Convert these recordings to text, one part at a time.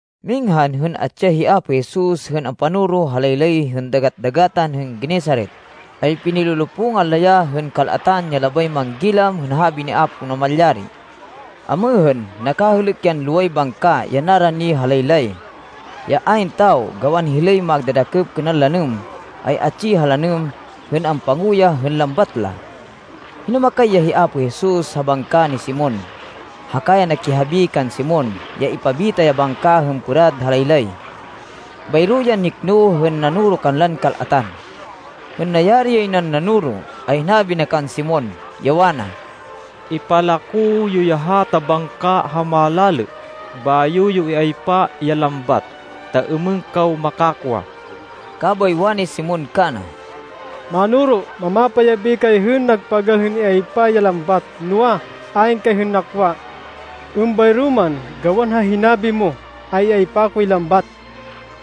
Minghan hên atsi ya hi Apo Jesus hên ampanoro ha laylay hên Dagat-dagatan hên Genesaret, ay pinilolopungan la ya hên kal-atan ya labay manggilam hên habi ni Apo Namalyari. Amêhên, nakahêlêk yan loway bangka ya narani ha laylay, ya ayn tawo gawan hilay magdadakêp kênan lanêm, ay atsi ha lanêm hên ampanguyah hên lambat la. Hinumakay ya hi Apo Jesus ha bangka ni Simon, haka ya nakihabi kan Simon ya ipabita ya bangka hên pêrad ha laylay. Bayro yan nikno hên nanoro kanlan kal-atan. Hên nayari yay nan nanoro ay hinabi na kan Simon, ya wana, “Ipalako yo ya hata bangka ha malalê bayo yo iaypa ya lambat ta êmên kaw makakwa.” Kabay wani Simon kana, “Mánoro, mamapayabi kay hên nagpagal hên an-iaypa ya lambat, noa, ayn kay hên nakwa. Êmbayro man, gawan ha hinabi mo, ay iaypa koy lambat.”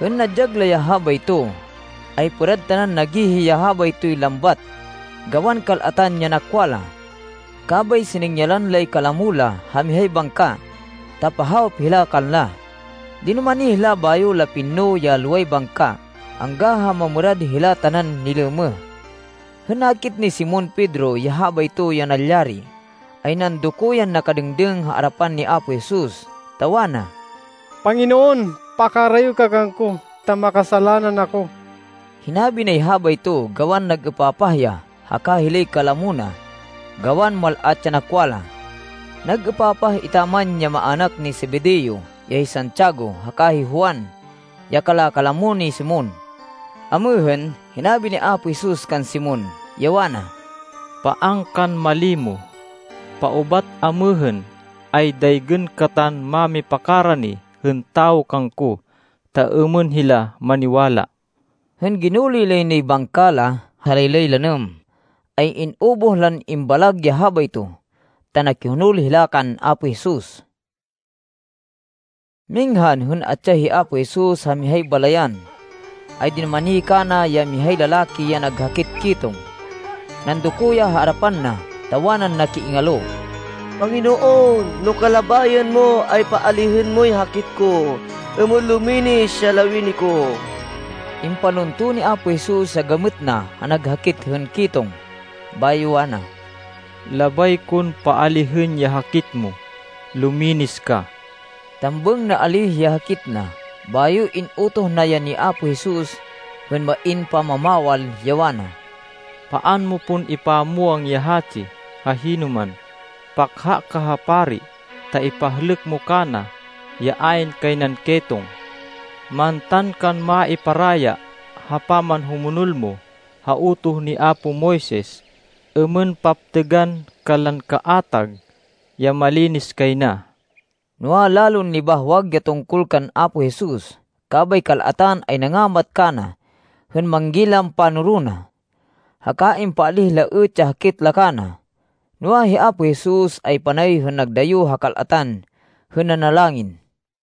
Hên nadyag la ya habayto, ay pêrad tanan nagihi ya habaytoy lambat gawan kal-atan ya nakwa la. Kabay siningyalan lay kalamo la ha mihay bangka, ta pahawop hila kanla. Dinumani hila bayo la pinno ya loway bangka angga ha mamêrad hila tanan nilêmêh. Hên nakit ni Simon Pedro ya habayto ya nalyari, ay nandoko yan nakadêngdêng ha arapan ni Apo Jesus ta wana, “Panginoon, pakarayo ka kangko ta makasalanan ako.” Hinabi nay habayto gawan nag-êpapah ya haka hilay kalamo na gawan mal-at ya nakwa la. Nag-êpapah etaman ya maának ni Zebedeo ya hi Santiago haka hi Juan, ya kala-kalamo ni Simon. Amêhên, hinabi ni Apo Jesus kan Simon, ya wana, “Paan kan malimo. Paubat amêhên, ay daygên katan mámipakarani hên tawo kangko, ta êmên hila maniwala.” Hên ginuloy lay nay bangka la ha laylay lanêm, ay in-ubuh lan imbalag ya habayto, ta nakihonol hila kan Apo Jesus. Minghan hên atsi ya hi Apo Jesus ha mihay balayan, ay dinumani kana ya mihay lalaki ya nag hakit ketong. Nandoko ya ha arapan na, ta wanan nakiingalo, “Panginoon, no kalabayan mo, ay paalihên moy hakit ko, êmên luminis ya lawini ko.” Impalunto ni Apo Jesus ya gamêt na ha nag hakit hên ketong, bayo wana, “Labay kon paalihên ya hakit mo. Luminis ka!” Tambêng naalíh ya hakit na. Bayo in-utoh na ya ni Apo Jesus hên main pamamawal, ya wana, “Paan mo pon ipamwang ya hatsi ha hinoman. Pakha ka ha pari ta ipahlêk mo kana ya ayn kay nan ketong. Mantan kan maiparaya ha pamanhumonol mo ha utoh ni apo Moises, êmên paptêgan kanlan kaatag ya malinis kay na.” Noa, lalon nibahwag ya tungkol kan Apo Jesus, kabay kal-atan ay nangamat kana hên manggilam panoro na. Haka impaalíh la êt ya hakit la kana. Noa, hi Apo Jesus ay panay hên nagdayo ha kal-atan hên nanalangin.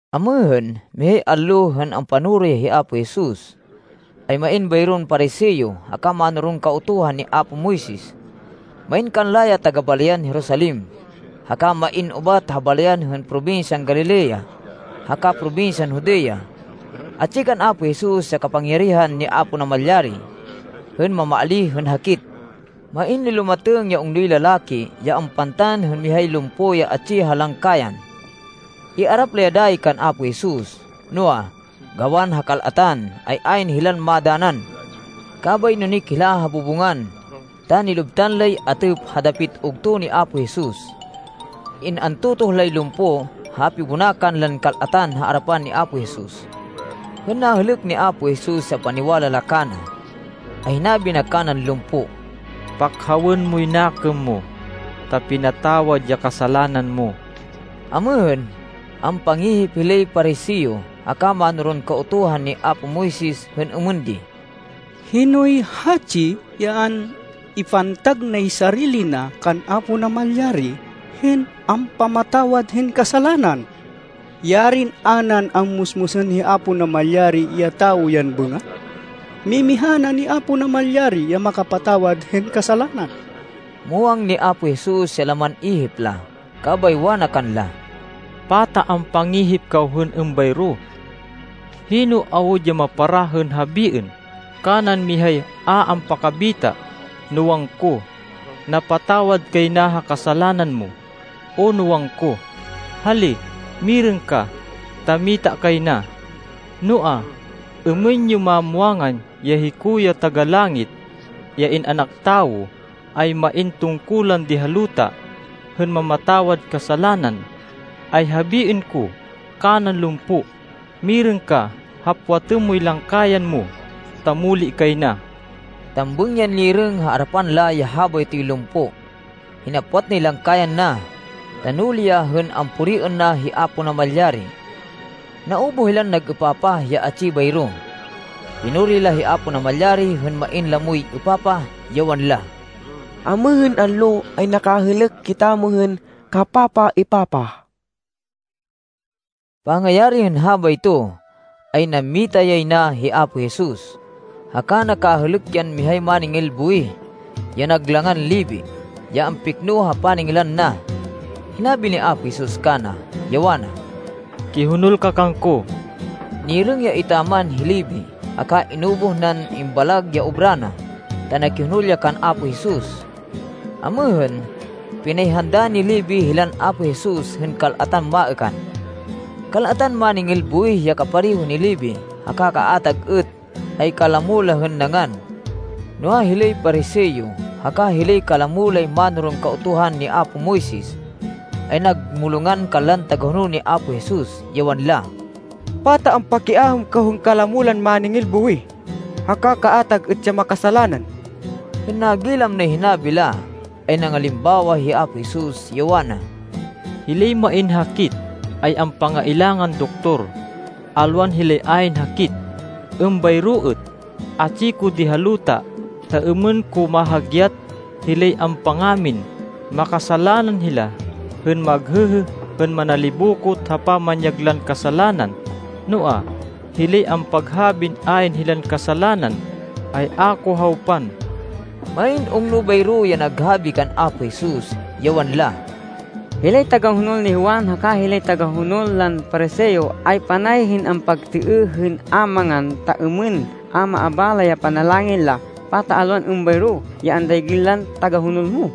Amêhên, mihay allo, hên ampanoro ya hi Apo Jesus, ay main bayron Pariseo haka mánoron Kautuhan ni apo Moises. Main kanla ya taga-balayan Jerusalem, haka main ubat ha balayan hên probinsyan Galilea haka probinsyan Judea. Atsi kan Apo Jesus ya kapangyarihan ni Apo Namalyari hên mamaalíh hên hakit. Main nilumatêng ya ungnoy lalaki ya ampantan hên mihay lumpo ya atsi ha langkayan. Iarap la ya dayi kan Apo Jesus. Noa, gawan ha kal-atan, ay ayn hilan madanan. Kabay nunik hila ha bubungan ta nilubtan lay atêp ha dapit ugto ni Apo Jesus. In-antotoh lay lumpo ha pibonakan lan kal-atan ha arapan ni Apo Jesus. Hên nahêlêk ni Apo Jesus ya paniwala la kana, ay hinabi na kanan lumpo, “Pakhawên moy nakêm mo, ta pinatawad ya kasalanan mo.” Amêhên, ampangihip hilay Pariseo haka mánoron Kautuhan ni apo Moises hên êmên di, “Hinoy hatsi ya an-ipantag nay sarili na kan Apo Namalyari hên ampamatawad hên kasalanan? Yarin a nan ammusmusên hi Apo Namalyari ya tawo yan bêngat! Mimiha na ni Apo Namalyari ya makapatawad hên kasalanan.” Muwang ni Apo Jesus ya laman ihip la. Kabay wana kanla, “Pata ampangihip kaw hên êmbayro? Hino awud ya maparah hên habiên kanan mihay a ampakabita, no wangko, ‘Napatawad kay na ha kasalanan mo,’ o no wangko, ‘Hali, mirêng ka ta mita kay na.’ Noa, êmên yo mamwangan ya hiko, ya Taga-Langit, ya In-anak Tawo, ay main tungkulan di ha luta hên mamatawad kasalanan, ay habiên ko kanan lumpo, ‘Mirêng ka. Hapwatên moy langkayan mo ta muli kay na.’” Tambêng yan nirêng ha arapan la ya habaytoy lumpo. Hinapwat nay langkayan na, ta nuli ya hên ampuriên na hi Apo Namalyari. Naubuh hilan nag-êpapah ya atsi bayro. Pinuri la hi Apo Namalyari hên main lamoy êpapah, ya wanla, “Amêhên allo ay nakahêlêk kitamo hên kapapaêpapah.” Pangayari hên habayto, ay nammita yay na hi Apo Jesus, haka nakahêlêk yan mihay máningil buwih ya nag langan Levi, ya ampikno ha paningilan na. Hinabi ni Apo Jesus kana, ya wana, “Kihonol ka kangko.” Nirêng ya etaman hi Levi, haka in-ubuh nan imbalag ya obra na, ta nakihonol ya kan Apo Jesus. Amêhên, pinayhanda ni Levi hilan Apo Jesus hên kal-atan maêkan. Kal-atan máningil buwih ya kapareho ni Levi, haka kaatag êt, ay kalamo la hên nangan. Noa, hilay Pariseo haka hilay kalamo lay mánoron Kautuhan ni apo Moises ay nagmulongan kanlan tagahonol ni Apo Jesus, ya wanla, “Pata ampakiaêm kaw hên kalamo lan máningil buwih haka kaatag êt ya makasalanan?” Hên nagilam nay hinabi la, ay nangalimbawa hi Apo Jesus, ya wana, “Hilay main hakit, ay ampangailangan doktor, alwan hilay ayn hakit. Êmbayro êt, atsi ko di ha luta ta êmên ko mahagyat hilay ampangamin makasalanan hila, hên maghêhê hên manalibokot ha pamanyag lan kasalanan. Noa, hilay ampaghabin ayn hilan kasalanan, ay a ko hawpan.” Main ungno bayro ya naghabi kan Apo Jesus, ya wanla, “Hilay tagahonol ni Juan haka hilay tagahonol lan Pariseo ay panay hên ampagtêêh hên a mangan ta êmên a maabala ya panalangin la. Pata alwan êmbayro ya andaygên lan tagahonol mo?”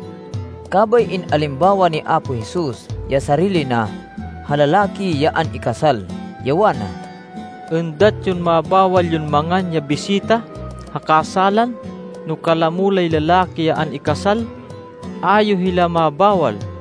Kabay in-alimbawa ni Apo Jesus ya sarili na ha lalaki ya an-ikasal, ya wana, “Êndat yon mabawal yon mangan ya bisita ha kasálan no kalamo lay lalaki ya an-ikasal? A yo hila mabawal.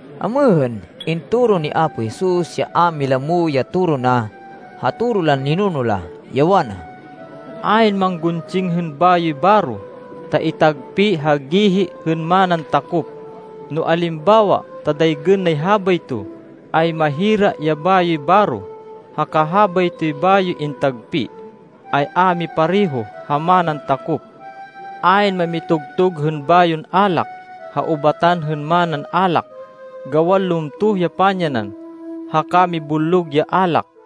Amêhên, intoro ni Apo Jesus ya a mailamo ya toro na, ha toro lan ninuno la, ya wana, “Ayn mangguntsing hên bayoy baro ta itagpi ha gihi hên manan takop. No alimbawa ta daygên nay habayto, ay mahira ya bayoy baro, haka habaytoy bayoy intagpi, ay a mipareho ha manan takop. Ayn mamitugtug hên bayon alak, ha ubatan hên manan alak, gawan lumtoh ya pamyanan, haka mibullog ya alak.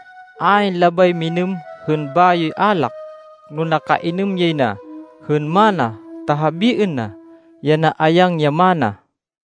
Ayn labay minêm hên bayoy alak no nakainêm yay na hên mana ta habiên na, ya naayang ya mana.”